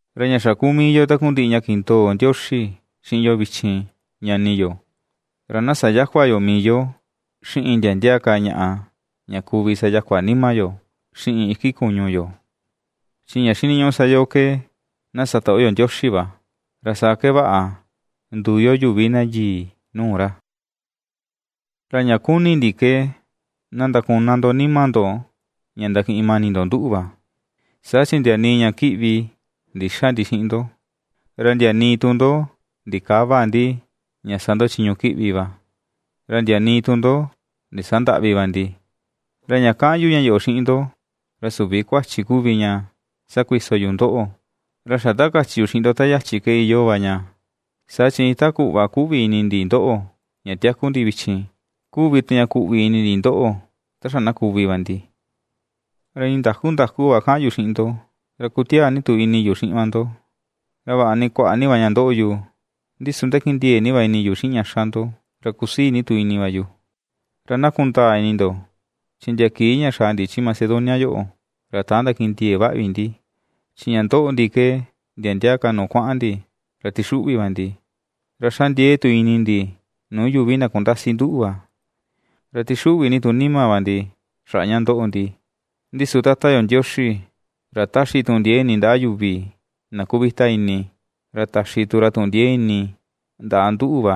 Ra ña xa kuu mii yo takundiꞌi ña kindoo Ndioxi xiꞌin yo vichin, ñani yo, ra na sayäkua yo mii yo xiꞌin ndia ndia ka ñaꞌa, ña kuvi sayakua nima yo, xiꞌin iki kuñu yo; chi ña xiniñuꞌu sa yo ke na satoꞌo yo Ndioxi va, ra saa ke vaꞌa nduu yo yuvi na yii nuu ra. Ra ña kuni ndi ke na ndakuña ndo nima ndo ña ndakiꞌin mani ndo nduꞌu va, saa chi ndia nii ña kiꞌvi ndïxa ndi xiꞌin ndo, ra ndia nii tu ndo ndikäva ndi ña sa ndo chiñu kiꞌvi va, ra ndia nii tu ndo ndisandäꞌvi va ndi. Ra ña kaꞌan yu ña yoꞌo xiꞌin ndo, ra süvi kuachi kuvi ña sakuiso yu ndoꞌo, ra xa ta kachi yu xiꞌin ndo ta yachi ke iyoo va ña, saa chi iin ta kuꞌva kuꞌvi ini ndi ndoꞌo, ña tiaku ndi vichin, kuvi tu ña kuꞌvi ini ndi ndoꞌo, ta xa na kuvi va ndi. Ra iin ndakú nda̱ku̱ va kaꞌan yu xiꞌin ndo, ra kutiaa ni tu ini yu xiꞌin va ndo. Ra vaꞌa ni kuaꞌa ni va ña ndoꞌo yu, ndi su ndakindiee ni va ini yu xiꞌin ña ^xa ndo, ra kusii ni tu ini va yu. Ra na kundaa ini ndo, chi ndia kii ña xa̱à ndi chi Macedonia yoꞌo, ra täan ndakindiee vaꞌa vi ndi, chi ña ^ndoꞌo ndi ke ndia ndia ka nuu kuaꞌan ndi ra tixuꞌvi va ndi, ra xa ndiee tu ini ndi nuu yuvi na kundasi nduꞌu va, ra tixuꞌvi ni tu nima va ndi xaꞌa ña ^ndoꞌo ndi. Ndi su Tata yo Ndioxi, ra ^taxi tuꞌun ndiee ini ndaꞌa yuvi na kuvita ini, ra taxi tu ra tuꞌun ndiee ini ndaꞌa nduꞌu va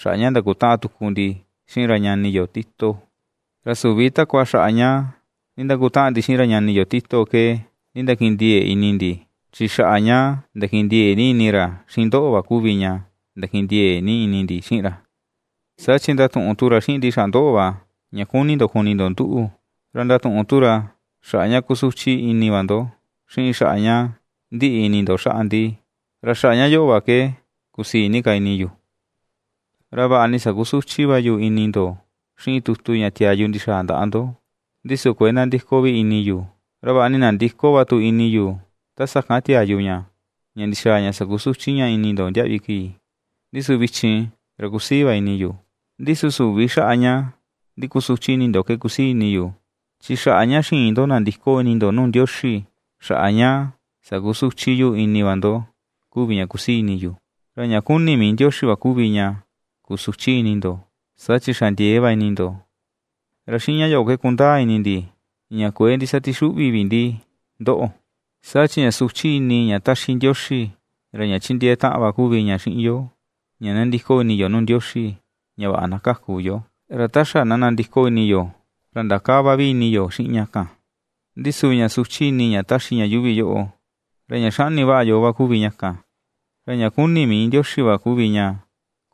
xaꞌa ña ndakutaꞌan tuku ndi xiꞌin ra ñani yo Tito; ra süvi takua xaꞌa ña ndindakutaꞌan ndi xiꞌin ra ñani yo Tito ke ndindakindiee ini ndi, chi xaꞌa ña ndakindiee ni ini ra xiꞌin ndoꞌo va kuvi ña ndakindiee ni ini ndi xiꞌin ra. Saa chi ndatuꞌun tu ra xiꞌin ndi xaꞌa ndoꞌo va, ña kuni ni ndo kuni ndo nduꞌu, ra ndatuꞌun tu ra xaꞌa ña kusuchi ini va ndo, xiꞌin xaꞌa ña ndiꞌi ini ndo xaꞌa ndi; ra xaꞌa ña yoꞌo va ke kusii ni ka ini yu. Ra vaꞌa ni sakusuchi va yu ini ndo xiꞌin tutu ña tiaa yu ndixaa ndaꞌa ndo, ndi su kuëe nandiko vi ini yu, ra vaꞌa ni ndandiko va tu ini yu ta sakan tiaa yu ña, ña ndixaa ña sakusuchi ña ini ndo, ndiaꞌvi kii, ndi su vichin ra kusii va ini yu, ndi su süvi xaꞌa ña ndikusuchi ini ndoꞌo ke kusii ini yu, chi xaꞌa ña xiin ndo nandiko ini ndo nuu Ndioxi, xaꞌa ña sakusuchi yu ini va ndo kuvi ña kusii ini yu. Ra ña kuni mii Ndioxi va kuvi ña kusuchi ini ndo, saa chi xa ndiee va ini ndo, ra xiꞌin ña yoꞌo ke ^kundaa ini ndi ña kuëe ndisatixuꞌvi vi ndi ndoꞌo. Saa chi ña suchi ini ña ^taxi Ndioxi, ra ña ^chindiee taꞌan va kuvi ña xiꞌin yo ña nandiko ini yo nuu Ndioxi ña vaꞌa na kaku yo, ra ta xa na nandiko ini yo, ra ndakäva vi ini yo xiꞌin ña kan; ndi su ña suchi ini ña ^taxi ña yuuvi yoꞌo, ra ña xaꞌni yoo va kuvi ña kan. Ra ña kuni mii va Ndioxi kuvi ña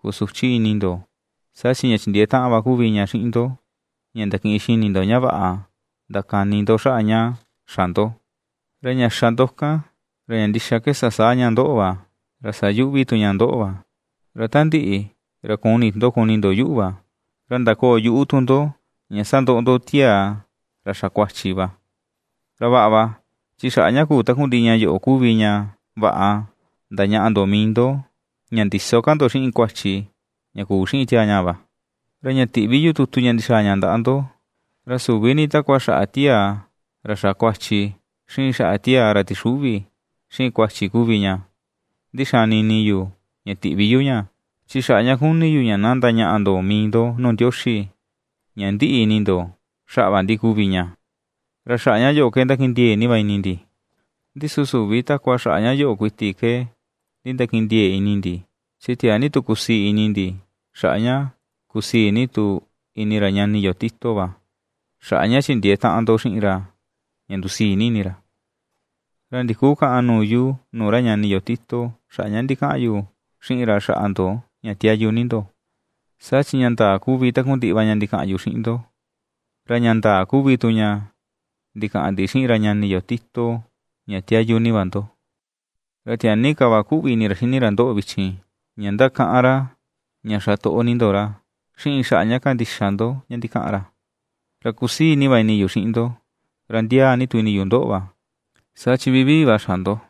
kusuchi ini ndo, saa chi ña chindiee taꞌan va kuvi ña xiꞌin ndo, ña ndakiꞌin xini ndo ña vaꞌa ndakani ndo xaꞌa ña xa ndo; ra ña xa ndo kan, ra ña ndixa ke sasaa ña ndoꞌo va, ra sayuꞌvi tu ña ndoꞌo va. Ra ta ndiꞌi, ra kuni tu ndo kuni ndo yuꞌu va, ra ndakoo yuꞌu tu ndo ña sandoꞌo ndo tiaa ra xa kuachi va. Ra vaꞌa va, chi xaꞌa ña kuu takundiꞌi ña yoꞌo kuvi ña vaꞌa ndañaꞌa ndo mii ndo ña ndïso ka ndo xiꞌin kuachi ña kuu xiꞌin tiaa ñaa va. Ra ña tiꞌvi yu tutu ña ndixaa ña ndaꞌa ndo, ra süvi ni takua xaꞌa tiaa ra xa kuachi, xiꞌin xaꞌa tiaa ra tixuꞌvi xiꞌin kuachi kuvi ña ndixani ini yu ña tiꞌvi yu ña, chi xaꞌa ña kuni yu ña na ndañaꞌa ndo mii ndo nuu Ndioxi ña ndiꞌi ini ndo xaꞌa va ndi kuvi ña. Ra xaꞌa ña yoꞌo ke ndakindiee ni va ini ndi. Ndi su süvi takua xaꞌa ña yoꞌo kuiti ke nindakindiee ini ndi, chi tiaa ni tu kusii ini ndi, xaꞌa ña kusii ni tu ini ra ñani yo Tito va, xaꞌa ña chindiee taꞌan ndo xiꞌin ra ña ndusii ni ini ra. Ra ndikukäꞌan nuu yu nuu ra ñani yo Tito xaꞌa ña ndikaꞌan yu xiꞌin ra xaꞌa ndo ña tiayu ni ndo. Saa chi ña ndaa kuvi takundiꞌi va ña ndikaꞌan yu xiꞌin ndo, ra ña ndaa kuvi tu ña ndikaꞌan ndi xiꞌin ra ñani yo Tito, ña tiayu ni va ndo. Ra tiaa ni ka va ^kuꞌvi ini ra xini ra ndoꞌo vichin, ña ^ndakaꞌan ra, ña xa toꞌo ni ndo ra, xiꞌin xaꞌa ña kandixa ndo ña ndikaꞌan ra. Ra kusii ni va ini yu xiꞌin ndo, ra ndiaa ni tu ini yu ndoꞌo va, saa chi vivii va xa ndo.